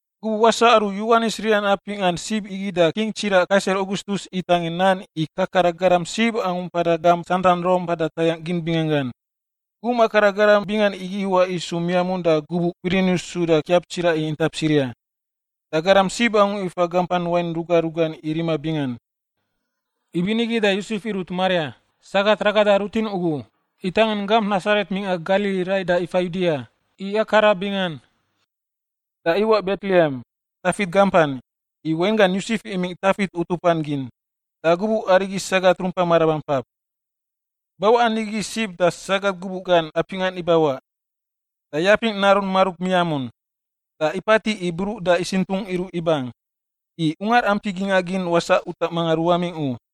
Gubuꞌ wasaꞌ aru Yowanis rinan apingꞌa sib igi da King tsiraꞌ Kaisar Augustus itangin nan i kakara garam sib angu mpada gamp santan Rom mpada tayangꞌ gin binganggan. Gum akara garam bingan igi iwaꞌ isu miamun da gubuꞌ Kwirinius suda kiap tsiraꞌ i intap Siria. Da garam sib angu ifa gampan wain ruga rugan i rima bingan. Ibinigi da Yosef irut Maria, sagat ragada rutin ugu, itangin gamp Nasaret mingꞌa Galili rai da ifa Yudia, i akara bingan. Da iwaꞌ Betlehem, Tafit gampan, i wainggan Yosef imingꞌ Tafit utupan gin. Da gubuꞌ arigi sagat rumpa marabampap. Bawaꞌa nigi sib da sagat gubuꞌ gan apingꞌan ibawaꞌ. Da yapingꞌ narun marub miamun, da ipatiꞌ i bruꞌ da isintungꞌ iruꞌ ibang. I ungar ampi gingꞌa gin wasaꞌ utaꞌ mangan ruwamingꞌ u.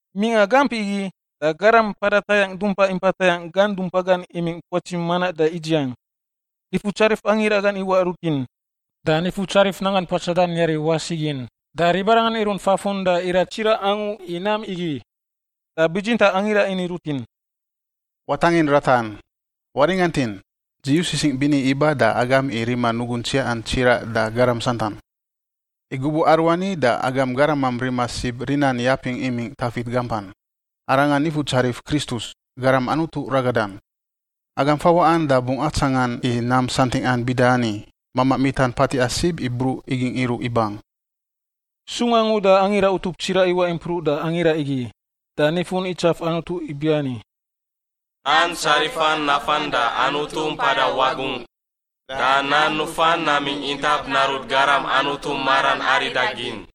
Mingꞌa gamp igi, da garam mpada tayangꞌ dumpa impa tayangꞌ gan dumpa gan imingꞌ puatsi manaꞌ da idziang. Nifutsarif angira gan iwaꞌ rutin, da Nifutsarif nanggan puatsadan yari wasi gin, da ribarangan irunt fafun da irat tsiraꞌ angu i nam igi. Da bitsintaꞌ angira ini rutin, “Watangin ratan. Waringantin! Dzi yu sisingꞌ bini iba da agam i rima nugun tsiaꞌan tsiraꞌ da garam santan. I gubuꞌ aruani da agam garamam rima sib rinan yapingꞌ imingꞌ Tafit gampan. Arangan Nifutsarif Kristus, Garam Anutu ragadan. Agam fawaꞌan da bungꞌ atsangan i nam santingꞌan bida ani: mamaꞌ mitan patiꞌa sib i bruꞌ igingꞌ iruꞌ ibang.” Sung angu da angira utup tsiraꞌ iwaꞌ impruꞌ da angira igi, da nifun itsaf Anutu ibiani: “Nan tsarifan nafan da Anutu mpada wagungꞌ, da nan nufan namingꞌ intap narut garam Anutu maran aridagin.”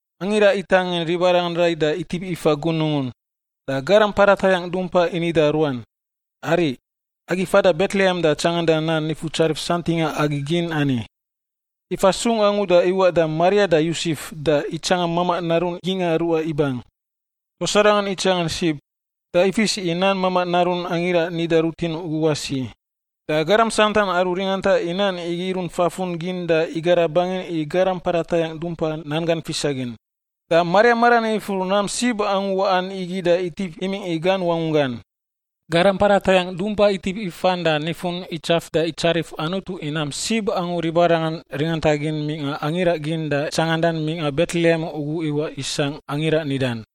Angira itangin ribarangan rai da itip ifa gunungun, da garam mpada tayangꞌ dumpa ini da ruan, “Ariꞌ, agi fada Betlehem da tsanganda nam Nifutsarif santingꞌa agi gin ani.” Ifa sung angu da iwaꞌ da Maria da Yosef da itsangan mamaꞌ narun gingꞌa ruꞌa ibang. Tuas arangan itsangan sib, da ifis i nan mamaꞌ narun angira nida rutin ugu wasi. Da garam santan aru ringanta i nan igi irunt fafun gin da igara bangin i garam mpada tayangꞌ dumpa nan gan fisagin. Da Maria maran ifur nam sib angu waꞌan igi da itip imingꞌ i gan wangunggan. Garam mpada tayangꞌ dumpa itip ifan da nifun itsaf da itsarif Anutu i nam sib angu ribarangan ringantagin mingꞌa angira gin da tsangandan mingꞌa Betlehem ugu iwaꞌ isangꞌ angira nidan.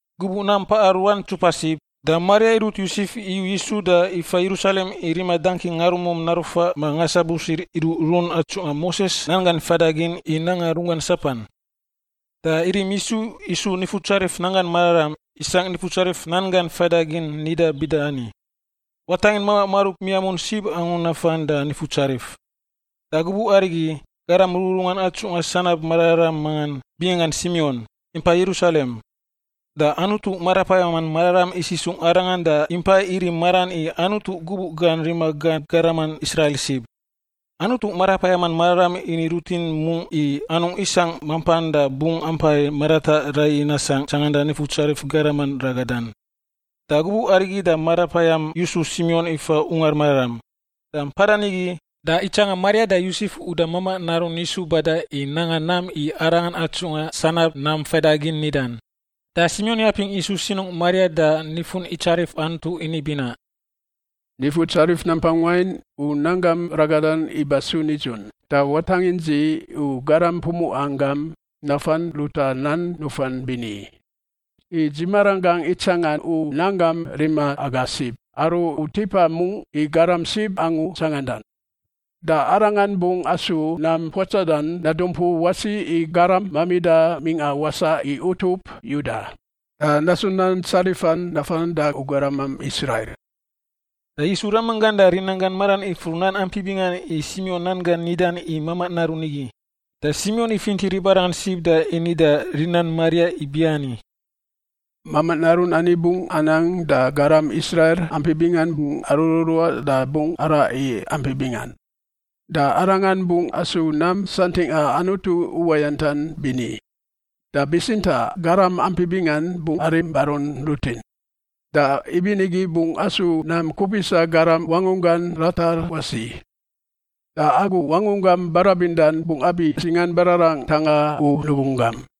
Gubuꞌ nam paꞌa ruan ntsupa sib, da Maria irut Yosef iyu Yisu da ifa Yerusalem i rima dangki ngarumum narufaꞌ ma ngasabusir iruꞌrun atsungꞌa Moses nan gan faidagin i nanga runggan sapan. Da irim Yisu isu Nifutsarif nanggan mararam, isangꞌ Nifutsarif nan gan faidagin nidan bida ani, “Watangin mamaꞌ marub miamun sib angu nafan da Nifutsarif.” Da gubuꞌ arigi, garam rururungan atsungꞌa sanab mararam mangan, binganggan Simion, impa Yerusalem. Da Anutu Marapayaman Mararam isisungꞌ arangan da impa irim maran i Anutu gubuꞌ gan rima gan garaman Israil sib. Anutu Marapayaman Mararam ini rutin mungꞌ i anungꞌ isangꞌ mampan da bungꞌ ampai marataꞌ raiyi nasangꞌ tsanganda Nifutsarif Garaman ragadan. Da gubuꞌ arigi da Marapayam yusu Simion ifa Ungar Mararam. Da mpada nigi, da itsangan Maria da Yosef uda mamaꞌ narun Yisu badan i nanga nam i Arangan atsungꞌa sanab nan faidagin nidan. Da Simion yapingꞌ Yisu sinungꞌ Maria da nifun itsarif Anutu ini binaꞌ: “Nifutsarif nampang wain, u nan gam ragadan ibasu nidzun, da watangin dzi, u garam pumuꞌan gam, nafan ruta nan nufan bini. I dzi maranggangꞌ itsangan u nanggam rima aga sib aru u tipa mungꞌ i garam sib angu tsangandan. Da Arangan bungꞌ asu nam puatsadan nadumpu wasi i garam mamida mingꞌa wasaꞌ i utup Yuda da nasu nan tsarifan nafan da u garamam Israil.” Da Yisu ramanggan da rinanggan maran ifur nan ampi bingan i Simion nan gan nidan i mamaꞌ narun igi. Da Simion ifinti ribarangan sib da ini da rinan Maria ibiani, “Mamaꞌ narun ani bungꞌ anang da garam Israil ampi bingan bungꞌ arururuaꞌ da bungꞌ araꞌ i ampi bingan. Da Arangan bungꞌ asu nam santingꞌa Anutu uwayantan bini, da bitsintaꞌ garam ampi bingan bungꞌ arim barun rutin. Da ibinigi bungꞌ asu nam kupisa garam wangunggan ratar wasi. Da agu wangunggam barabindan bungꞌ abi singan bararang ntanga u nugunggam.”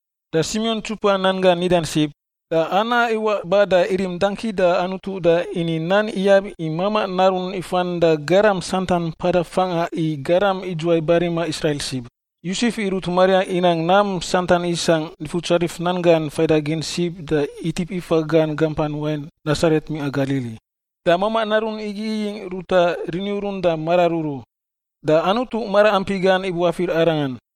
Da Simion ntsupa nan gan nidan sib, da Ana iwaꞌ ba da irim dangki da Anutu da ini nan iyab i mamaꞌ narun ifan da garam santan mpada fangꞌa i garam idzuwai barima Israil sib. Yosef irut Maria inang nam santan isangꞌ Nifutsarif nan gan faidagin sib da itip ifa gan gampan wain Nasaret mingꞌa Galili. Da mamaꞌ narun igi iyingꞌ ruta riniurun da mararuru, da Anutu maraampi gan ibuafir Arangan.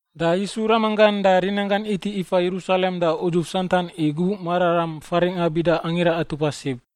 Da Yisu ramanggan da rinanggan iti ifa Yerusalem da udzuf santan i gubuꞌ mararam faringꞌa bida Angira Atupa Sib.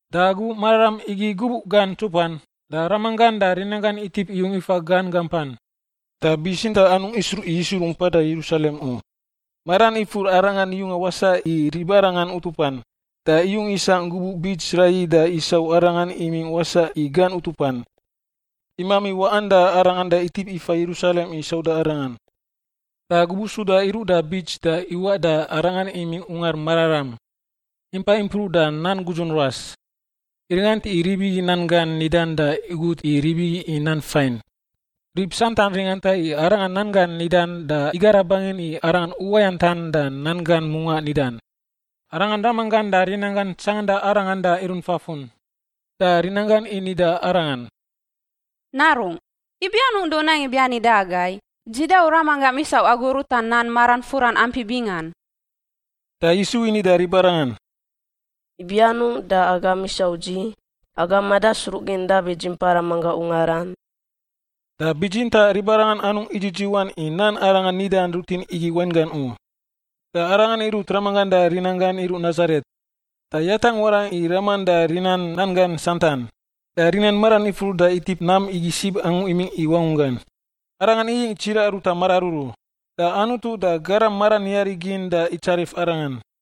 Da gubuꞌ mararam igi gubuꞌ gan ntsupan, da ramanggan da rinanggan itip iyung ifa gan gampan, da bitsintaꞌ anungꞌ isruꞌ i Yisu rumpada Yerusalem u. Maran ifur Arangan yunga wasaꞌ i ribarangan utupan, da iyung isangꞌ gubuꞌ bits raiyi da isau Arangan imingꞌ wasaꞌ i gan utupan. Imami waꞌan da Arangan da itip ifa Yerusalem i sauda Arangan. Da gubuꞌ suda iruꞌ da bits da iwaꞌ da Arangan imingꞌ Ungar Mararam, impa impruꞌ da nan gudzun ruas, iringant i rib igi nan gan nidan da igut i rib igi i nan fain. Rib santan ringanta i Arangan nan gan nidan da igara bangin i Arangan uwayantan da nan gan mungaꞌ nidan. Arangan ramanggan da rinanggan tsanganda Arangan da irunt fafun. Da rinanggan ini da Arangan, “Narungꞌ, ibi anungꞌ da u nang ibiani da agai? Dzi da u ramanggam isau agu ruta nan maran furan ampi bingan.” Da Yisu ini da ribarangan, “Ibi anungꞌ da agam isau dzi? Agam madasruꞌgin dabi dzi mpa ramanggangꞌ ungaran?” Da bitsintaꞌ ribarangan anungꞌ idzidziwan i nan Arangan nida rutin igi wainggan u. Da Arangan irut ramanggan da rinanggan iruꞌ Nasaret, da yatangꞌ warangꞌ i raman da rinan nan gan santan. Da rinan maran ifur da itip nam igi sib angu imingꞌ i wangunggan. Arangan iyingꞌ tsiraꞌ ruta mararuru, da Anutu da garam maran yari gin da itsarif Arangan.